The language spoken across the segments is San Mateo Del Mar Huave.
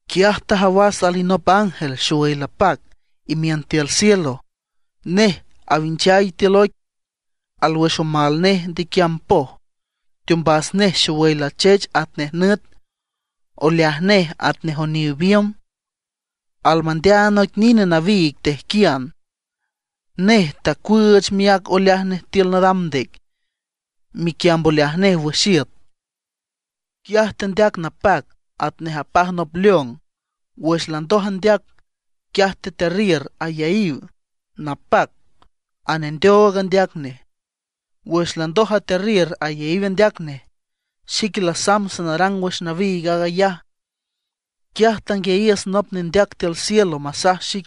Quiaj tajawas alinop ángel xowüy lapac, imiün tiül cielo. Nej awinchay tiül oic, alwüx omal nej ndequiamb poj. Teombas nej xowüy lachech atnej nüt, oleaj nej atnej oniw biümb. Almandeaand noic nine nawiig tejquian. Nej tacuüüch miác oleaj nej tiül nadam ndec, miquiamb oleaj nej wüx iüt. Quiaj tendeac napac atnej apaj nop león. Wüx landoj andeac, quiaj tetearriür ayaíw napac anendeoog andeac nej. Wüx landoj atearriür ayaíw andeac nej, xique lasamb sanarang wüx nawiig aag ayaj, quiaj tanguiayiüs nop nendeac tiül cielo masaj xic: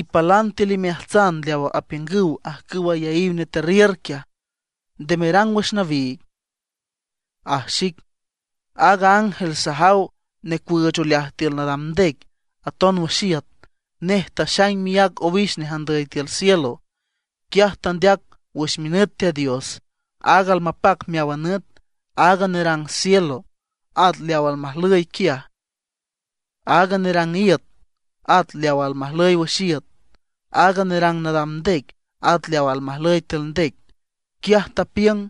―Ipálan tiül imeaats leawa apiüngüw ajcüwa ayaíw netearriür quiaj, nde merang wüx nawiig ―aj xic. Aaga ángel sajaw necuüüch oleaj tiül nadam ndec, aton wüx iüt, nej taxaing miác owix nej andüy tiül cielo. Quiaj tandeac wüx minüt Teat Dios, aaga almapac meáwan nüt, aaga nerang cielo at leawa almajlüy quiaj, aaga nerang iüt at leawa almajlüy wüx iüt, aaga nerang nadam ndec at leawa almajlüy tiül ndec. Quiaj tapiüng: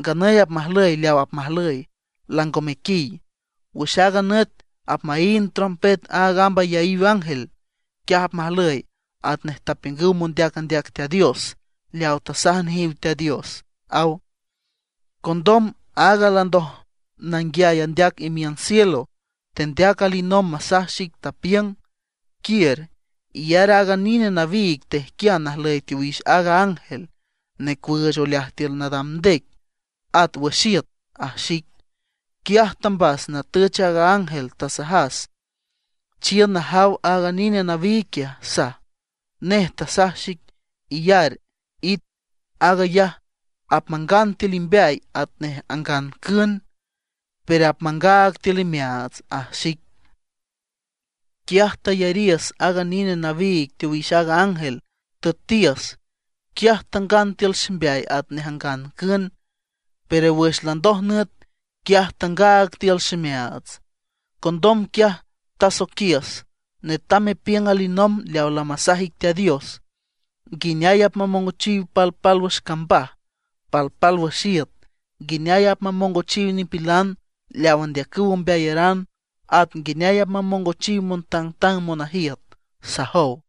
―Nganüy apmajlüy leaw apmajlüy, lango mequiy; wüx aaga nüt apmaínd trompet aaga amb ayaíw ángel, quiaj apmajlüy atnej tapiüngüw mondeac andeac Teat Dios, leaw tasaj nejiw Teat Dios ―aw. Condom aaga landoj nanguiay andeac imiün cielo, tendeac alinomb masaj xic, tapiüng: ―Quiür, iyar aaga nine nawiig tejquian najlüy teowix aaga ángel necuüüch oleaj tiül nadam ndec at wüx iüt ―aj xic. Quiaj tambas natüch aaga ángel, tasajas: ―Chiün najaw aaga nine nawiig quiaj ―saj. Nej tasaj xic: ―Iyar, it, aag ayaj apmangan tiül imbeay atnej angan cün, pero apmangaag tiül imeaats ―aj xic. Quiaj tayariüs aaga nine nawiig teowix aaga ángel, tüetiüs. Quiaj tangan tiül ximbeay atnej angan cün, pero wüx landoj nüet, quiaj tangaag tiül ximeaats. Condom quiaj tasoiquiüs: ―Netam mepiüng alinomb leaw lamasaj ic Teat Dios, nguineay apmamongochiw palpálwüx cambaj, palpálwüx iüt; nguineay apmamongochiw nipilan leaw andeacüw ombeayaran, at nguineay apmamongochiw montangtang monajiüt ―sajow.